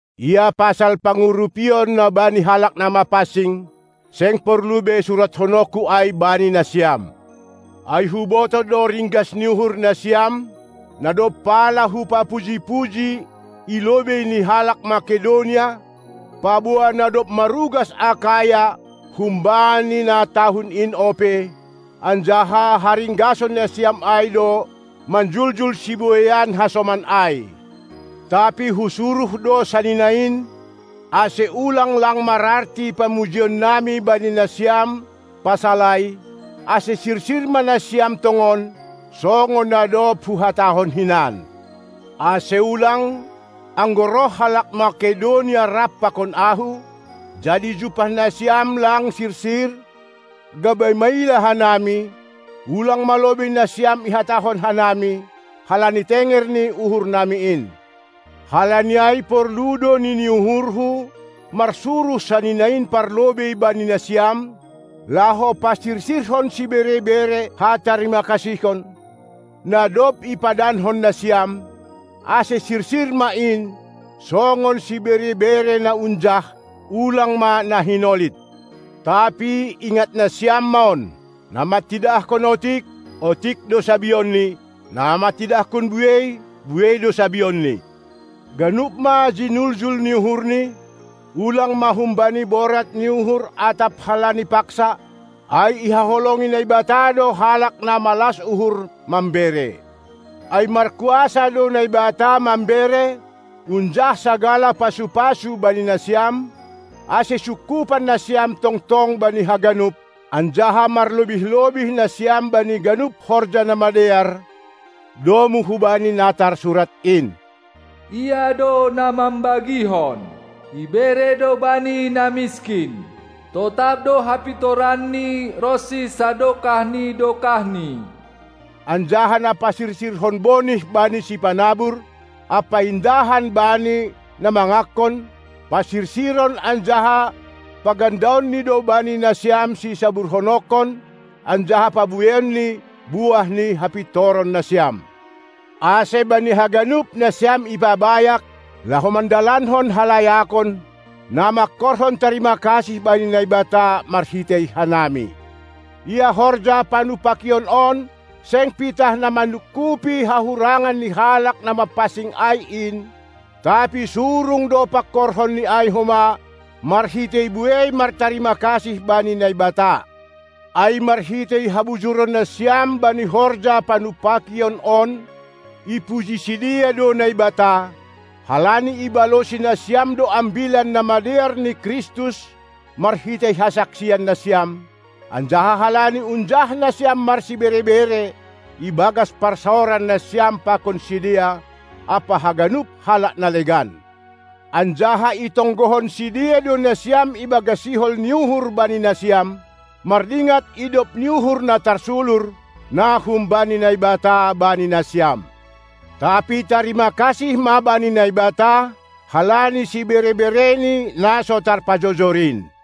Ia pasal pangurupion na bani halak na mapansing, seng porlu be surathononku ai bani nasiam. Ai hubotoh do ringgas ni uhur nasiam, na dob pala hupapuji-puji i lobei ni halak Makedonia, paboa na dob marugas Akaya humbani na tahun in ope, anjaha haringgason nasiam ai do manjuljul sibueian hasoman ai. Tapi husuruh do sanina in, ase ulang lang mararti pamujinami bani nasiam pasal ai, ase sirsir ma nasiam tongon, songon na dob huhatahon hinan; ase ulang, anggo roh halak Makedonia rap pakon ahu, jadi jumpah nasiam lang sirsir, gabe maila hanami, ulang ma lobei nasiam ihatahon hanami, halani tenger ni uhurnami in. Halani ai porlu do nini uhurhu, marsuruh sanina in parlobei bani nasiam, laho pasirsirhon sibere-bere hatarimakasihon, na dob ipadankon nasiam, ase sirsir ma in, songon sibere-bere na unjah, ulang ma na hinolit. Tapi ingat nasiam ma on: Na mantidahkon otik, otik do sabionni; na mantidahkon buei, buei do sabionni. Ganup ma jinuljul ni uhurni, ulang ma humbani borat ni uhur atap halani paksa, ai ihaholongi Naibata do halak na malas uhur mambere. Ai markuasa do Naibata mambere unjah sagala pasu-pasu bani nasiam, ase sungkupan nasiam tongtong bani haganup, anjaha marlobih-lobih nasiam bani ganup horja na madear, domu hubani na tarsurat in: Ia do na mambagihon, ibere do bani na miskin; totap do hapintoranni ronsi sadokah ni dokahni. Anjaha na pasirsirhon bonih bani sipanabur ampa indahan bani na mangankon, pasirsiron anjaha pagandaonni do bani nasiam sisaburhononkon anjaha pabueionni buah ni hapintoron nasiam. Ase bani haganup nasiam ipabayak, laho mandalankon halayakon, na mangkorhon tarima kasih bani Naibata, marhitei hanami. Ia horja panumpakion on seng pitah na manungkupi hahurangan ni halak na mapansing ai in, tapi surung do pangkorhon ni ai homa marhitei buei martarima kasih bani Naibata. Ai marhitei habujuron nasiam bani horja panumpakion on ipuji sidea do Naibata, halani ibalosi nasiam do Ambilan Namadear ni Kristus marhitei hasaksian nasiam, anjaha halani unjah nasiam marsibere-bere ibagas parsaoran nasiam pakon sidea ampa haganup halak na legan. Anjaha itonggohon sidea do nasiam ibagas sihol ni uhur bani nasiam, mardingat idop ni uhur na tarsulur, na humbani Naibata bani nasiam. Tapi tarima kasih ma bani Naibata halani sibere-bereni, na so tarpajojor in.